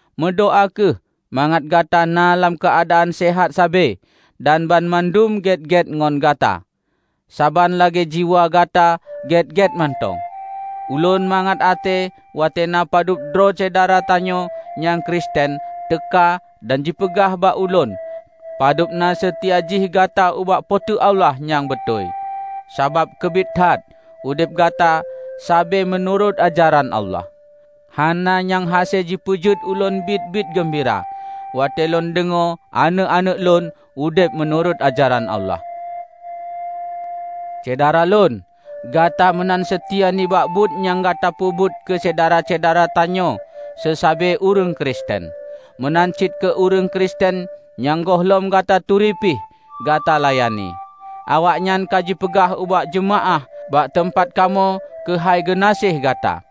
meudoá kheueh mangat Gata na lam keuadaan seuhat sabe dan banmandum gét-gét ngon gata, saban lagée jiwa gata gét-gét mantong. Ulôn mangat até watée na padub droe syedara tanyoe nyang Kristen teuka dan jipeugah bak ulôn padub na seutia jih Gata ubak Po teu Allah nyang beutôi, sabab keubiet that udeb Gata sabe meunurot ajaran Allah. Hana nyang hase jipeujeuet ulôn biet-biet geumbira, watée lôn deungoe aneuëk-aneuëk ulôn udeb meunurot ajaran Allah. Syedara lôn! Gata meunan seutia nibak buet nyang Gata peubuet keu syedara-syedara tanyoe seusabe ureuëng Kristen; meunan cit keu ureuëng Kristen nyang gohlom Gata turi pih, Gata layani. Awaknyan ka jipeugah ubak jeumaáh bak teumpat kamoe keuhai geunaséh gata.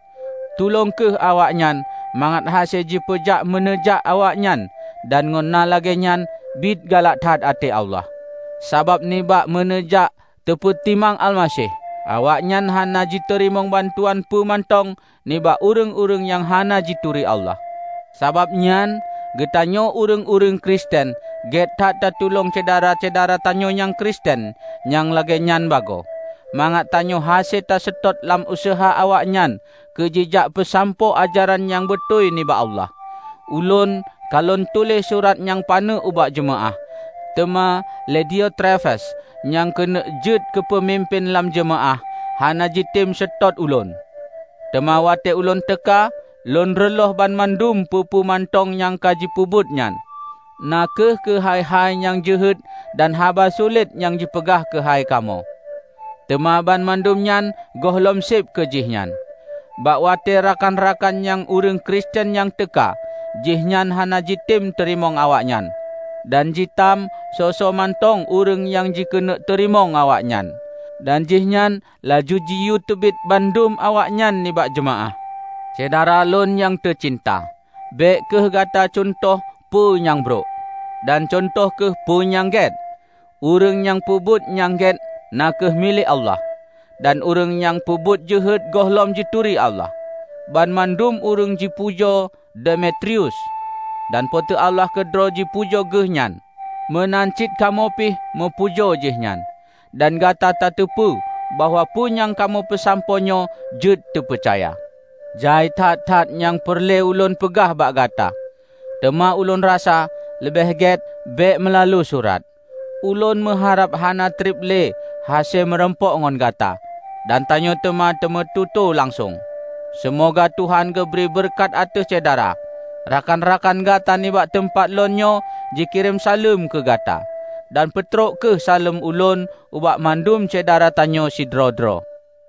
Tulông kheueh awaknyan mangat hase jipeujak meuneujak awaknyan dan ngon na lagée nyan biet galak that até Allah, sabab nibak meuneujak teupeutimang Almaseh, awaknyan hana jiteurimong bantuan peue mantong nibak ureuëng-ureuëng nyang hana jituri Allah. Sabab nyan, geutanyoe ureuëng-ureuëng Kristen gét that tatulong syedara-syedara tanyoe nyang Kristen nyang lagée nyan bagoe, mangat tanyoe hase taseutôt lam useuha awaknyan keujijak peusampoe ajaran nyang beutôi nibak Allah. Ulôn ka lôn tuléh surat nyang paneuk ubak jeumaáh, teuma lé Diotrefes nyang keuneuk jeuet keupeumimpén lam jeumaáh, hana jitem seutôt ulôn. Teuma watée ulôn teuka, lôn reuloh banmandum peue-peue mantong nyang ka jipeubuet nyan, na kheueh keuhai-hai nyang jeuhet dan haba sulet nyang jipeugah keuhai kamoe! Teuma banmandum nyan gohlom seb keu jihnyan. Bak watée rakan-rakan nyang ureuëng Kristen nyan teuka, jihnyan hana jitem teurimong awaknyan. Dan jitam soe-soe mantong ureuëng nyang jikeuneuk teurimong awaknyan, dan jihnyan laju jiyue teubiet bandum awaknyan nibak jeumaáh! Syedara lôn nyang teucinta, bék kheueh gata cuntoh peue nyang brok. Dan cuntoh kheueh peue nyang gét. Ureuëng nyang peubuet nyang gét na kheueh milék Allah. Dan ureuëng nyang peubuet jeuhet gohlom jituri Allah. Banmandum ureuëng jipujoe Demetrius. Dan Po teu Allah keudroe jipujoe geuh nyan. Meunan cit kamoe pih meupujo jihnyan, dan Gata tateupeue bahwa peue nyang kamoe peusampoe nyoe jeuet teupeucaya. Jai that-that nyang peureulée ulôn peugah bak gata, teuma ulôn rasa leubeh gét bék meulalu surat. Ulôn meuharab hana treb lé hase meurumpok ngon gata, dan tanyoe teuma tameutoe langsong. Seumoga Tuhan geubri beureukat ateueh Syedara. Rakan-rakan gata nibak teumpat lôn nyoe jikirém saleuem keu gata. Dan peutrok kheueh saleuem ulôn ubak mandum syedara tanyoe sidroe-droe.